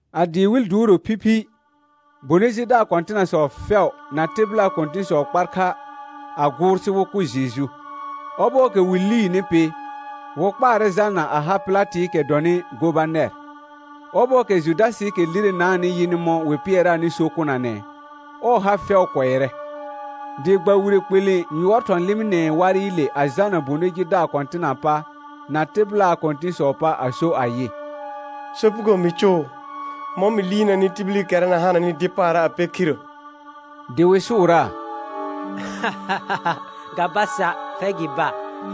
A dɩɩ wɩl duuro phiphi, bonɩ jidaar kɔ̃tɩnasɔ fɛʋ na tɩbɩlaa kɔ̃tɩ̃sɔ kpar kha a gʋʋr sɩ wɩ kʋ Jeju. Ɔbɔɔkɛ wɩ liini pɩ, wɩ kpaarɛ jalna a ha Pɩlatɩɩkɛ dɔnɩ gobanɛr. Ɔbɔɔkɛ Judasɩɩkɛ lirenaanɩ yɩnɩ mɔ̃ wɩ pɩɛraanɩ so kʋnanɛ, ɔɔ ha fɛʋ kʋɛrɛ, dɩ gba wire kpelẽ yʋɔr thɔ̃ lɩmɩnɛɛ warɩle, a jalna bonɩ jidaar kɔ̃tɩnaa pa na tɩbɩlaa kɔ̃tɩ̃sɔɔ pa a so ayɩ: Sopugo mɩ cʋʋ, mɔ̃ mɩ liirnanɩ tibilikɛra na hananɩ dɩ paara' a pɛ khirrə. Dɩ wɩ sʋʋraa: Ga ba sa', fɛr gɩ ba.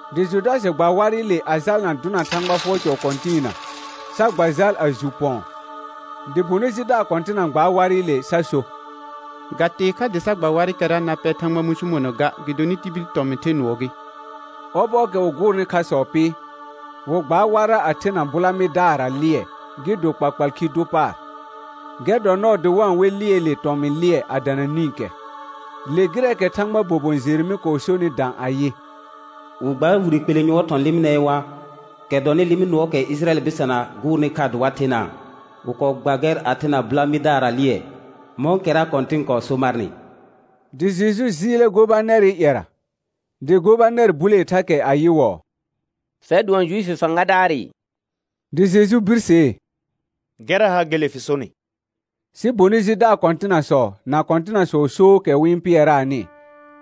Dɩ Judasɩ gba warɩle a jalna dʋna Thãgba fʋɔr cɔ kɔ̃tɩɩna, sa gba jal a ju pɔ̃ɔ. Dɩ bonɩ jidaar kɔ̃tɩna gbaar warɩle sa so: Ga tee kha dɩ sa gba warɩkɛra na pɛ Thãgba mũsumona ga, gɩdonɩ tibil tɔmɩ̃ the nʋɔ gɩ; ɔbɔɔkɛ wɩ gʋʋrnɩ khasɔ pɩ, wɩ gbaar warra a thena bʋla mɩdaarra lɩɛ gɩ do kpakpal khi dʋ paar. Gɛr dɔ nɔɔ dɩ wa-n we lɩɛɛle tɔmɩ̃ lɩɛ a dana nĩkɛ. Le gɩrɛɛkɛ Thãgbaa bobon Jeremɩ kɔɔ sonɩ dã ayɩ: «Wɩ gbaar wire kpelẽ yʋɔr thɔ̃ lɩmɩnɛɛ war, kɛ dɔnɩ lɩmɩ nʋɔɔkɛ ɩjɩrayɛl bɩsana gʋʋrnɩ kha dɩ wa thenaa; Wɩ kɔɔ gba gɛr a thena bʋla mɩdaarra lɩɛ, mɔ̃kɛra Kɔ̃tɩn kɔɔ so marnɩ.» Dɩ Jeju jɩɩlɛ gobanɛrɩ ƴɛra, dɩ gobanɛr bulee thakɛ ayɩwɔɔ: Fɛr dʋɔn Juifi fãgadaarɩ? Dɩ Jeju birsee: Gɛrra ha gele fɩ sonɩ. Sɩ bonɩ jidaar kɔ̃tɩnasɔ na kɔ̃tɩnasɔɔ sookɛ wɩ-n pɩɛraanɩ,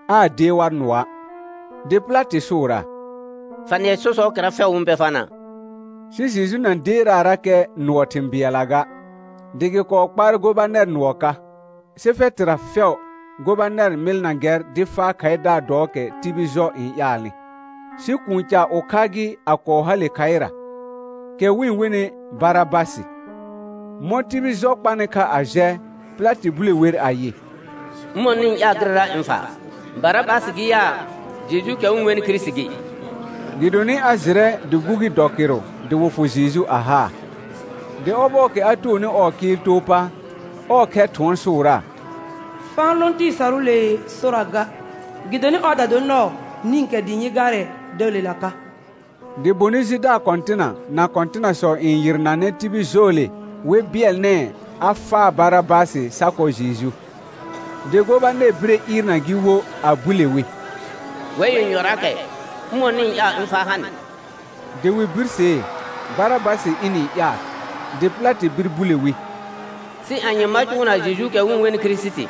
aa dee war nʋɔa'. Dɩ Pɩlatɩ sʋʋraa: Fa nɩɛ sɔsɔɔkɛra fɛʋ wɩ-n pɛ farnaa? Sɩ Jeju na deeraarakɛ nʋɔ thɩ̃ bɩɛlla ga, dɩ gɩ kɔɔ kpaarɛ gobanɛr nʋɔ ka. Sɩ fɛtɩra fɛʋ gobanɛr mɩlna gɛr dɩ faa khaɩdaar dɔɔkɛ tibil jɔ n ƴaalnɩ. Sɩ kũu ca ʋkha gɩ a kɔɔ hale khaɩra, kɛ wɩ-n wenɩ Barabasɩ. Mɔ̃ tibil jɔ kpanɩ kha a jɛ, Pɩlatɩ bule wer ayɩ: Ʋmɔ̃ nɩ-n ƴaal gɩrɛra ɩ̃ faa, Barabasɩ gɩ yaa, Jejuukɛ wɩ-n wenɩ Kirisiti gɩ? Gɩdonɩ a jɩrɛ dɩ gbugi dɔ kɩrʋ dɩ wɩ fʋ Jeju a haa. Dɩ ɔbɔɔkɛ a toonɩ ɔɔ kɩɩl too pa, ɔɔ khɛr thʋɔn sʋʋraa: Fa-n lõ tɩɩ sarʋʋlee sora ga, gɩdonɩ ɔɔda dor nɔɔ nĩkɛ dɩ ɩ̃ yɩ gaarɛ dəəlela ka. Dɩ bonɩ jidaar kɔ̃tɩna na kɔ̃tɩnasɔ n yɩrnanɛ tibil jɔɔle wɩ bɩɛlnɛɛ a faa Barabasɩ sa kɔ Jeju. Dɩ gobanɛr bire ɩɩrna gɩ wo a bule wi: Wɛr yenyɔraakɛ, ʋmɔ̃ nɩ-n ƴaal ɩ̃ faa ha nɩ? Dɩ wɩ birsee, Barabasɩ ɩnɩ-n ƴaal. Dɩ Pɩlatɩ bir bule wi: Sɩ anye ma cʋʋna Jejuukɛ wɩ-n wenɩ Kirisiti?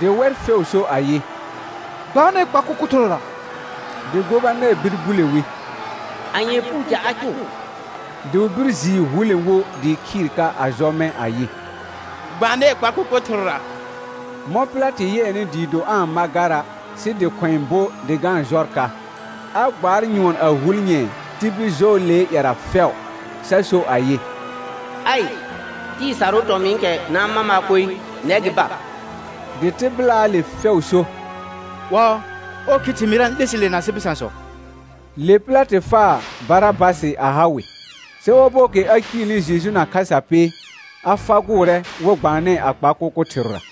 Dɩ wɛr fɛʋ so ayɩ: Gbanɛɛ kpa kʋkʋ thɩrʋra. Dɩ gobanɛr bir bule wi: Anyee puu ca a cʋʋ? Dɩ wɩ bir jɩɩ hulẽ wo dɩɩ khɩɩr ka a jɔ mɛ̃ ayɩ: Gbanɛɛ kpa kʋkʋ thɩrʋra. Mɔ̃ Pɩlatɩ yɩɛnɩ dɩɩ do aa-n ma gara' sɩ dɩ khʋ̃ɛ bo dɩ ga-n jɔr ka, a gbaar nyʋɔn a hul nyɛ̃ɛ tibil jɔɔlee ƴɛra fɛʋ, sa so ayɩ: Aɩ, tɩɩ sarʋʋ tɔmɩ̃ɩkɛ na-n ma maa koe, nɛr gɩ ba. Dɩ tɩbɩlaale fɛʋ so: Ɔɔ, ɔɔ khi thɩmɩɩra n 'le sɩ le na asɩ bɩsãsɔ. Le Pɩlatɩ faa Barabasɩ a ha wɩ, sɩ ɔbɔɔkɛ a ciilni Jeju na khasa pɩ, a fagʋʋrɛ wɩ gbaanɛɛ a kpa kʋkʋ thɩrʋra.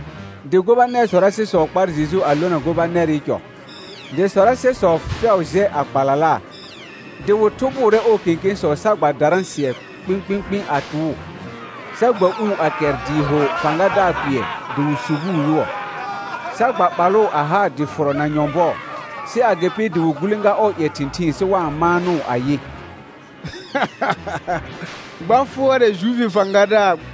Dɩ gobanɛr sɔrasɩsɔ kpar Jeju a lona gobanɛrɩ cɔ, dɩ sɔrasɛsɔ fɛʋ jɛ a kpalalaa. Dɩ wɩ thʋbʋʋrɛ ɔɔ kẽkẽsɔ sa gba darã sɩɛ kpɩ̃kpɩ̃kpɩ̃ a tʋʋ, sa gba uu a kɛr dɩɩ ho fãgadaar kpɩɛr dɩ wɩ subuu yʋɔ, sa gba ɓalʋʋ a haa dɩ fʋrɔ na nyɔ̃bɔɔ. Sɩ agɩpɩ dɩ wɩ gulẽga ɔɔ ƴɛ thɩ̃thɩɩn sɩ wa-n maanʋʋ ayɩ: Gba fʋɔrɛ Juifi fãgadaar.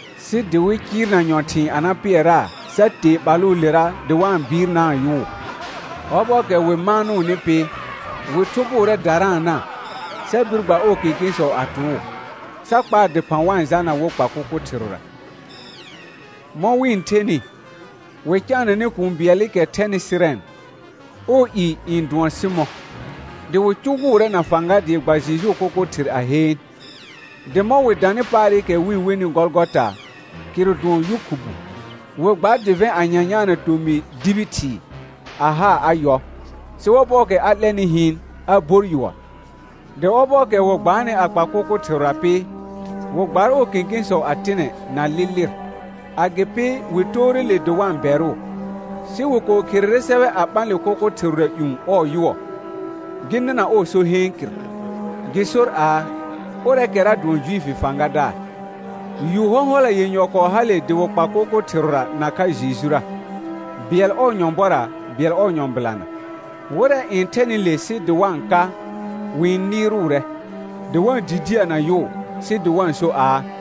Sɩ dɩ wɩ cɩɩrna nyɔ̃thɩ̃ɩ a na pɩɛraa sa tee ɓalʋʋlera dɩ wa-n bɩɩrnaa yʋʋ. Ɔbɔɔkɛ wɩ maanʋʋnɩ pɩ, wɩ thʋbʋʋrɛ daraana, sa bir gba ɔɔ kẽkẽsɔ a tʋʋ, sa kpaa dɩphã wa-n jalna wɩ kpa kʋkʋ thɩrʋra. Mɔ̃ wɩ-n thenɩ, wɩ caananɛ kũu bɩɛlɩkɛ thɛnɩ Sɩrɛn, ɔɔ i n dʋɔn Sɩmɔ̃. Dɩ wɩ cʋgʋʋrɛ na fãga dɩ gba Jejuu kʋkʋ thɩr a heen. Dɩ mɔ̃ wɩ danɩ paarɩkɛ wɩ-n wenɩ Gɔlgɔta, kɩrʋ dʋɔn Yʋ khubu, wɩ gbaar dɩvɛ̃ a nyanyaana tomɩ dibi thɩɩ a haa a yɔ. Sɩ ɔbɔɔkɛ a 'lɛnɩ hɩɩn, a bor yʋɔr. Dɩ ɔbɔɔkɛ wɩ gbaanɩ a kpa kʋkʋ thɩrʋra pɩ, wɩ gbaar ɔɔ kẽkẽsɔ a tɩnɛ na lɩ lɩr. Agɩpɩ wɩ toore le dɩ wa-n bɛrʋʋ. Sɩ wɩ kɔɔ kherere sɛbɛ a ɓã le kʋkʋ thɩrʋra ƴũ ɔɔ yʋɔ, gɩ nɩna ɔɔ so heen kɩr, gɩ sor aa: Ʋrɛɛkɛra dʋɔn Juifi fãgadaar. Yu hɔ̃hɔla yenyɔ kɔɔ hale dɩ wɩ kpa kʋkʋ thɩrʋra nakha Jejura, bɩɛl ɔɔ nyɔ̃bɔra, bɩɛl ɔɔ nyɔ̃bɩlana. Wɩrɛ n thɛnɩ le sɩ dɩ wa-n ka, wɩ-n nɩɩrʋʋrɛ, dɩ wa-n didiəna yʋʋ, sɩ dɩ wa-n so aa: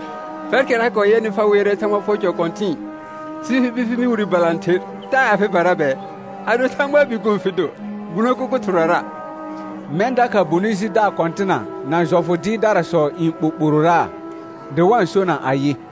Fɛrkɛra kɔɔ yɛnɩ, fa wɩɛrɛ Thãgba fʋɔr cɔ kɔ̃tɩ̃ɩ sɩ fɩ bir fɩ mɩ wire balãther, taa afɩbara bɛɛ. Ado Thãgbaa Bikuun fɩ do, gbuno kʋkʋ thɩrʋrara. Mɛ̃ dakha bonɩ jidaar kɔ̃tɩna na jɔfʋ dɩɩrdarasɔ n ɓoɓororaa, dɩ wa-n sona ayɩ: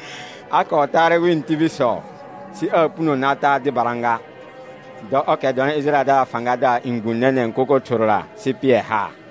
A kɔɔ taarɛ wɩ̃ tibilsɔ, sɩ aa puno na taa dɩbara ga. Dɔ ɔrkɛ dɔnɩ Ɩjɩrayɛldaraa fãgadaar n gbũ nɛnɛ̃ kʋkʋ thɩrʋra sɩ pɩɛ haar.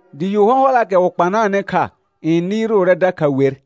Dɩ yu hɔ̃hɔlaakɛ wɩ kpanaanɩ kha n nɩɩrʋʋrɛ dakha wer.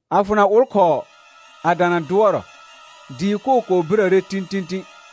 A fʋna ʋlkhɔɔ a dana dʋɔrɔ, dɩɩ koo kɔɔ birəre tĩtĩtĩ.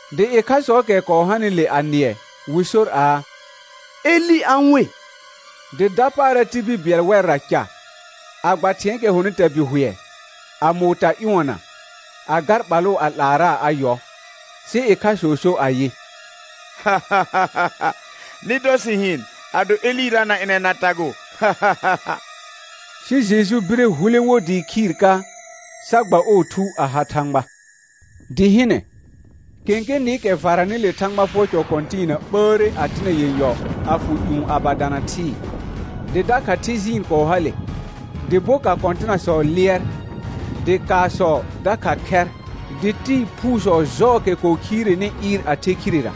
Dɩ ɩkhasɔɔkɛ kɔɔ hanɩle a nɩɛ, wɩ sor aa: Elɩ a-n we. Dɩ dapaara tibil bɩɛl wɛrra ca, a gba thɩ̃ɛɛkɛ hɔnɩ tabɩhʋɛ, a mʋʋ ta ƴʋɔna, a gar ɓalʋʋ a 'laaraa a yɔ. Sɩ ɩkhasɔ so ayɩ: Nɩ dɔ sɩ hɩɩn, ado Elɩra na ɩnɛ na tagʋʋ. Sɩ Jeju bire hulẽ wo dɩɩ khɩɩr ka, sa gba ɔɔ thu a ha Thãgba. Dɩ hɩnɛ, kẽkẽ nɩɩkɛ varanɩ le Thãgba fʋɔr cɔ kɔ̃tɩɩna ɓəəre a tɩnɛ yenyɔ a fʋ ƴũ a ba dana thɩɩ; dɩ dakha thɩɩ jɩɩn kɔɔ hale, dɩ boka kɔ̃tɩnasɔ lɩɛr; dɩ kaasɔ dakha khɛr, dɩ tɩɩ phuusɔ jɔɔkɛ kɔɔ khireni ɩɩr a thɩɩr khirera.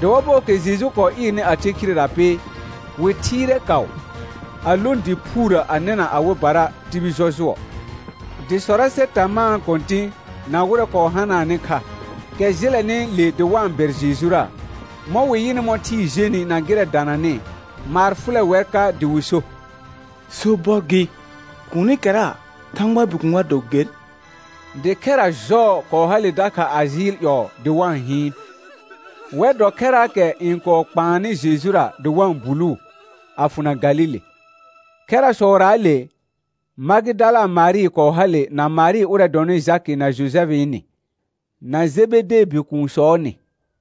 Dɩ ɔbɔɔkɛ Jeju kɔɔ ɩɩrnɩ a the khirera pɩ, wɩ thɩɩrɛ kaʋ, a lõ dɩ phuurə a nɩna awɩbara tibil jɔjʋɔ. Dɩ sɔrasɛ tamaa kɔ̃tɩ̃ na wɩrɛ kɔɔ hanaanɩ kha, kɛ jɩlɛnɩ le dɩ wa-n bɛr Jejura, mɔ̃ wɩ yɩnɩ mɔ̃ thɩɩ jenɩ na gɩrɛ dananɩ, maar fʋlɛ wɛr ka dɩ wɩ so: Sobɔr gɩ, kuunikɛra Thãgbaa Bikuun a do ger. Dɩ khɛra jɔɔ kɔɔ hale dakha a jɩɩl ƴɔɔ dɩ wa-n hɩɩn. Wɛr dɔ khɛraakɛ n kɔɔ kpaannɩ Jejura dɩ wa-n buluu, a fʋna Galile. Khɛrasɔraale, Magɩdala Marɩ kɔɔ hale na Marɩ ʋrɛ dɔnɩ Jakɩ na Jojɛfɩɩ nɩ, na Jebedee bikuunsɔɔ nɩ.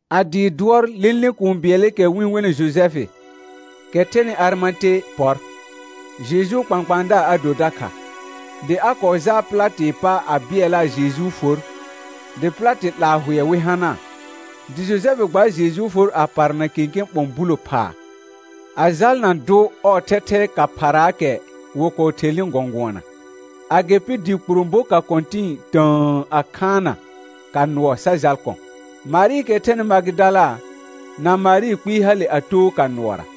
A dɩɩ dʋɔr lẽle kũu bɩɛlɩkɛ wɩ-n wenɩ Jojɛfɩ, kɛ thɛnɩ Arɩmate pɔr. Jejuu kpãkpãadaar a do dakha. Dɩ a kɔɔ jaal Pɩlatɩɩ pa a bɩɛlaa Jejuu for, dɩ Pɩlatɩ 'laa hʋɛ wɩ hanaa. Dɩ Jojɛfɩ gbaar Jejuu for a parna kẽkẽ ɓɔ̃ bulo phaa, a jalna dʋ ɔɔ thɛthɛɛ ka phaaraakɛ wɩ kɔɔ thelnɩ gɔ̃gʋɔna. Agɩpɩ dɩ kpuro boka kɔ̃tɩ̃ɩ tə̃ə a khaanna ka nʋɔ sa jal kɔ̃. Marɩɩkɛ thɛnɩ Magɩdala, na Marɩ kpɩɩ hale a too ka nʋɔra.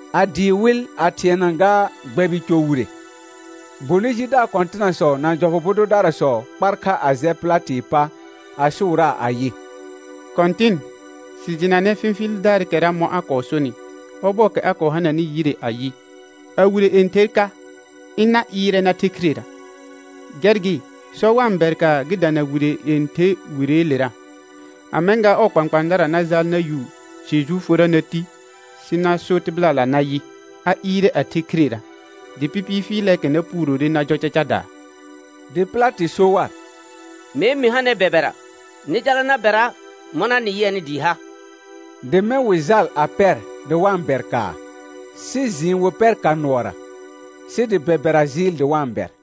A dɩɩ wɩl a thɩɛna gaa gbɛbɩ cɔ wire, bonɩ jidaar kɔ̃tɩnasɔ na jɔfʋ bʋ dʋdarasɔ kpar kha a jɛ Pɩlatɩɩ pa, a sʋʋraa ayɩ: Kɔ̃tɩn, sɩ jɩnanɛ fɩfɩɩldaarɩkɛra mɔ̃ a kɔɔ sonɩ, ɔbɔɔkɛ a kɔɔ hananɩ yire ayɩ, a wire yẽther ka, ɩna ɩɩrɛ na the khirera. Gɛr gɩ, sɔ wa-n bɛr kaa gɩ dana wire yẽther wireelera, a mɛ̃ gaa ɔɔ kpãkpãadara na jaal na yu Jejuu forra na ti, sɩ na so tɩbɩlala nayɩ: A ɩɩrɛ a the khirera. Dɩ pɩpɩɩ fɩɩlɛɛkɛ na puurore na jɔ cacadaa. Dɩ Pɩlatɩ so war: Mee mɩ ha nɛr bɛbɛra, nɩ jala na bɛra mɔna nɩ yɩɛnɩ dɩɩ ha. Dɩ mɛ̃ wɩ jal a pɛr dɩ wa-n bɛr kaa, sɩ jɩɩn wɩ pɛr ka nʋɔra, sɩ dɩ bɛbɛra jɩɩl dɩ wa-n bɛr.